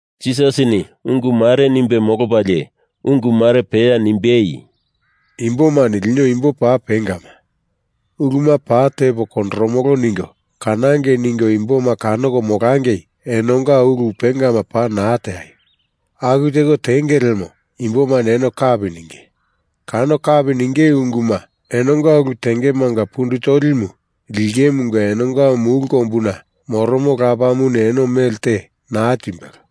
Jisasini ungu mare nimbe molopalie ungu mare peya nimbei, “Imbomani lino imbo paa pengama. Uluma paa tepo kondoromolo ningo kanangei ningo imboma kanoko molangei enonga ulu pengama paa naa teaio. Aku teko tenge lemo imbomani eno kapi ninge. Kano kapi ninge unguma enonga ulu tengemanga pundu tolimu lingemunga enonga mulu kombuna moromo Lapamuni eno mele te naa timbelo.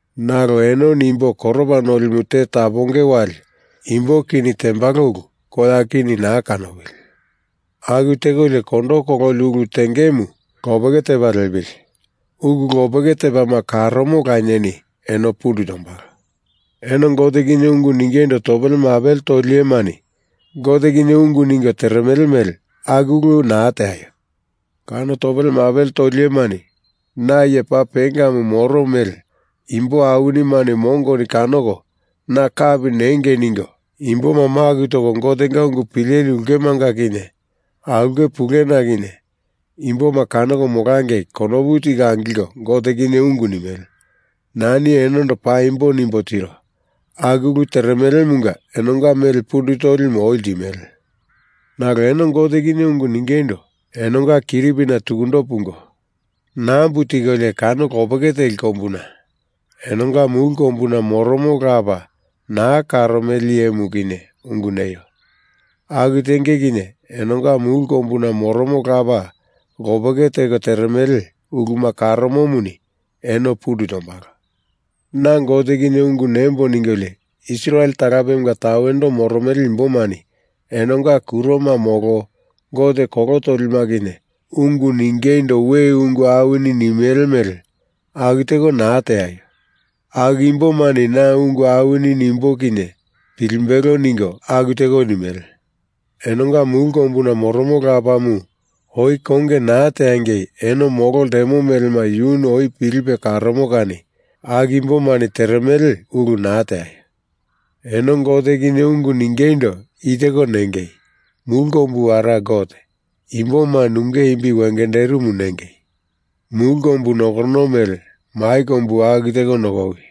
Nalo enoni imbo koropa nolimu te taponge wali imbo kini tembalo ulu koya kini naa kanopili. Aku tekolio kondo kololi ulu tengemu lopeke tepa lepili. Ulu lopeke tepama karomo Lanieni eno pundu tombalo. Eno Gote kinye ungu ningeindo topele mapele toli iyemani Gote kinye ungu ningo teremele mele aku ulu naa teaio. Kano topele mapele toli iyemani na iye paa pengamu moro mele imbo awinimani mongoni kanoko na kapi nengei ningo imboma maku toko Gotenga ungu pileli ulkemanga kinye aulke puluna kinye imboma kanoko molangei konopu tiko angilko Gote kinye ungu nimele. Nani enondo paa paimbo nimbo tiro. Aku ulu teremelemunga enonga mele pundu tolimu oi limele. Nalo eno Gote kinye ungu ningeindo enonga kiripina tukundo pungo nambu tikolio kano lopeke teli kombuna enonga mulu kombuna moromo Lapa naa karomele iyemu kinye ungu neio. Aku tenge kinye enonga mulu kombuna moromo Lapa lopeke teko teremele uluma karomomuni eno pundu tombalo. Na Gote kinye ungu nembo ningolio Israel talapemunga tawendo moromele imbomani enonga kuroma molo gote kolo tolima kinye ungu ningeindo we ungu awini nimele mele aku teko naa teaio. Aku imbomani na ungu awini nimbo kinye pilimbelo ningo aku teko nimele. Enonga mulu kombuna moromo Lapamu oi konge naa teangei eno molo ltemo melema yuni oi pilipe karomo kani aku imbomani teremele ulu naa teaio. Eno Gote kinye ungu ningeindo i teko nengei, Mulu Kombu Ara Gote, imboma nunge imbi wengenderimu nengei. Mulu kombu nokorono mele mai kombu aku teko nokowi.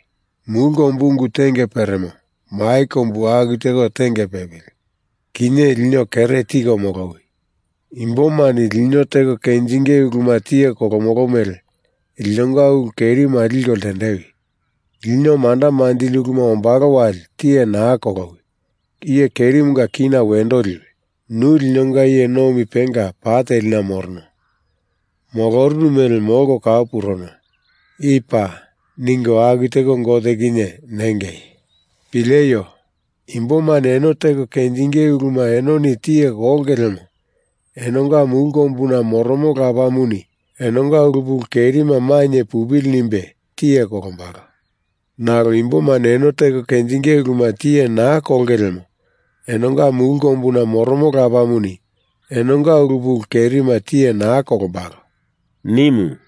Mulu kombu ungu tenge peremo, mai kombu aku teko tenge pepili. Kinye lino kere tiko molowi. Imbomani lino teko kenjinge uluma tiye kolomolo mele, Linonga ulu kerima liko ltendewi. Lino manda manjili uluma ombalo wali tiye naa kolowi. Iye kerimunga kina wendo liwi. Nu linonga iye nomi penga pa telina morono. Molorunu mele molko kau puruno. I paa. ningo aku teko Gote kinye nengei. Pileio. Imbomani eno teko kenjinge uluma enoni tiye kolonge lemo enonga mulu kombuna moromo Lapamuni enonga ulu pulu kerima mainye pupili nimbe tiye kolombalo. Nalo imbomani eno teko kenjinge uluma tiye naa kolonge lemo enonga mulu kombuna moromo Lapamuni enonga ulu pulu kerima tiye naa kolombalo,” nimu.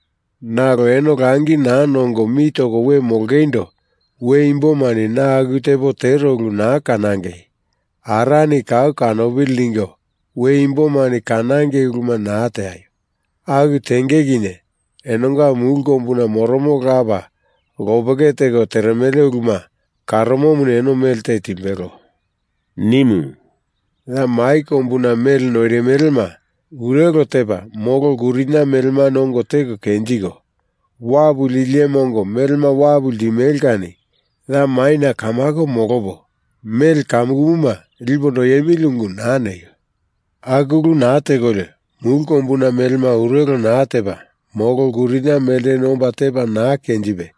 Nalo eno langi naa nongo mi toko we molongeindo we imbomani na aku tepo tero ulu naa kanangei, Arani kau kanopili ningo we imbomani kanangei uluma naa teaio. Aku tenge kinye enonga mulu kombuna moromo Lapa lopeke teko teremele uluma karomomuni eno mele te timbelo,” nimu. “Ya mai kombuna mele noirimelema urelo tepa molo lkurinia melemani ongo teko kenjiko, wapu lili iyema ongo melema wapu limele kani ya maina kamako molopo mele kamukumuma lipo noiemili ungu naa neio. Aku ulu naa tekolio mulu kombuna melema urelo naa tepa molo lkurinia melteni omba tepa naa kenjipe,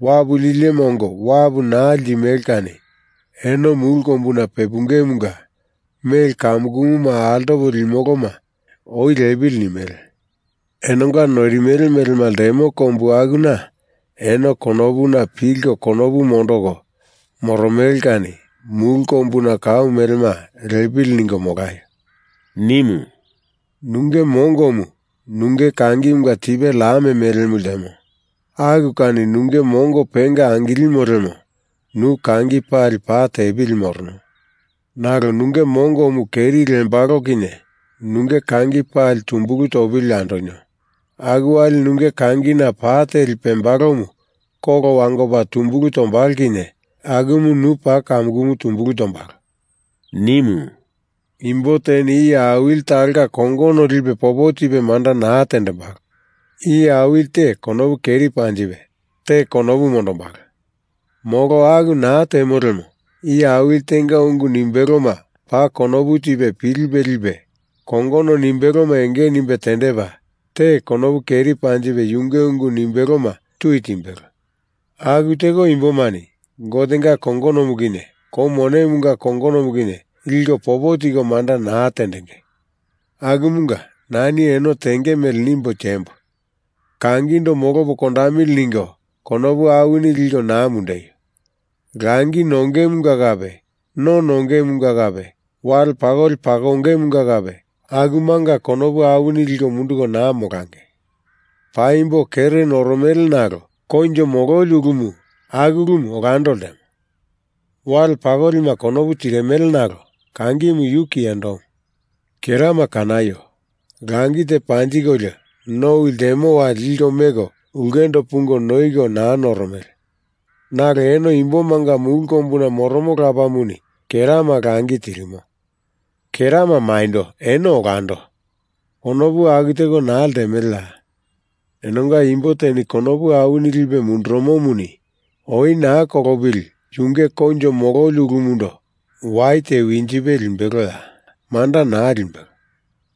wapu lili iyema ongo wapu naa limele kani eno mulu kombuna pepungemunga mele kamukumuma altopo limoloma oi lepili nimele. Enonga noirimele melema ltemo kombu akuna eno konopuna pilko konopu mondoko moromele kani mulu kombuna kau melema lepili ningo molaio,” nimu. “Nunge mongomu nunge kangimunga tipe lam mele ltemo. Aku kani nunge mongo penga angilimo lemo nu kangi pali pa tepili morono. Nalo nunge mongomu keri lembalo kinye nunge kangi pali tumbulu topili andonio. Aku wali nunge kangina pa teli pembalomu kolo wangopa tumbulu tombalo kinye akumu nu paa kamukumu tumbulu tombalo,” nimu. Imbo teni iye awili talonga kongono lipe popo tipe manda naa tendembalo. Iye awili te konopu keri panjipe, te konopu mondombalo. Molo aku naa temo lemo iye awili tenga ungu nimbeloma paa konopu tipe pilipe lipe kongono nimbeloma enge nimbe tendepa, te konopu keri panjipe yunge ungu nimbeloma tui timbelo. Aku teko Imbomani Gotenga kongonomu kinye Kou Monemunga kongonomu kinye liko popo tiko manda naa tendenge. Akumunga nani eno tenge mele nimbo tiembo. Kangindo molopo kondamili ningo konopu awini liko naa mundeio. Langi nongemunga kape no nongemunga kape wale pakoli pakongemunga kape akumanga konopu awini liko munduko naa molangei. Paimbo kere noromele nalo koinjo mololi ulumu aku ulumu olando ltemo. Wale pakolima konopu tirimele nalo kangimu yu kiyendomu. Kerama kanaio. Langi te panjikolio nowi ltemo wali liko meko ulkendo pungo noiko naa noromele nalo eno imbomanga mulu kombuna moromo Lapamuni kerama langi tirimo. Kerama maindo eno olando, konopu aku teko naa ltemeleya? Enonga imbo teni konopu awini lipe mundurumomuni oi naa kolopili yunge koinjo mololi ulumundo wai te winjipe limbeloya? Manda naa limbelo.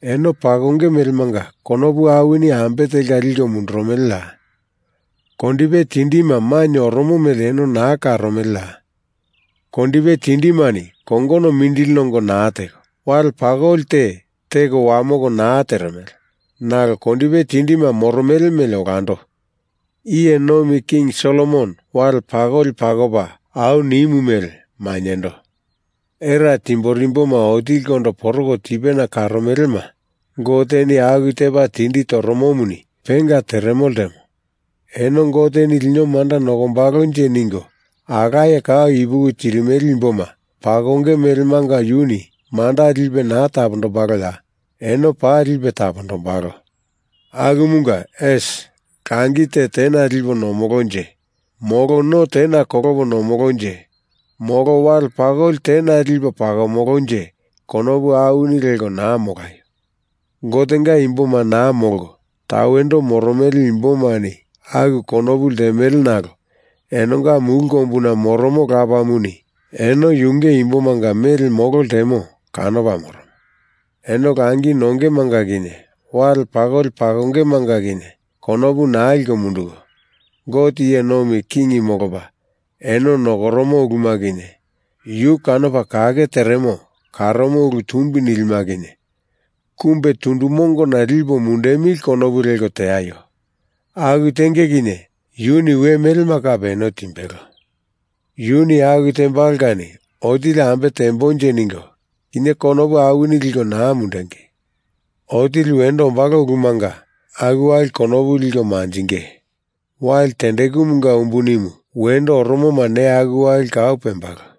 Eno pakonge melemanga konopu awini ambe telka liko mundurumeleya? Kondipe tindima maina oromo mele eno naa karomeleya? Kondipe tindimani kongono mindili nongo naa teko, wale pakoli te teko wamoko naa teremele nalo kondipe tindima moromele mele olando, iye nomi king Solomon wale pakoli pakopa au nimu mele mainyendo. Era timborimboma otilikondo poroko tipena karomelema Goteni aku tepa tindi toromomuni penga teremo ltemo eno Goteni lino manda nokombalonje ningo alaye kau ipuki tirimele imboma pakonge melemanga yuni manda lipe naa tapondombaloya? Eno paa lipe tapondombalo. Akumunga, esi, langi te tena lipo nomolonje, molo no tena kolopo nomolonje, molo wale pakoli tena lipo pakomolonje konopu awini leko naa molaio. Gotenga imboma naa molko tawendo moromele imbomani aku konopu ltemele nalo enonga mulu kombuna moromo Lapamuni eno yunge imbomanga mele molo ltemo kanopa moromo. Eno langi nongemanga kinye wale pakoli pakongemanga kinye konopu naa liko munduko, Gote iye nomi king molopa eno nokoromo uluma kinye yu kanopa kake teremo karomo ulu tumbi nilima kinye kumbe tundu mongo lipo mundemili konopu leko teaio. Aku tenge kinye yuni we melema kape eno timbelo. Yuni aku tembalo kani otili ambe tembonje ningo kinye konopu awini liko naa mundengei. Otili wendo ombalo ulumanga aku wali konopu liko manjinge. Wali tendekumumunga umbuni wendo oromoma neya aku wali kau pembalo.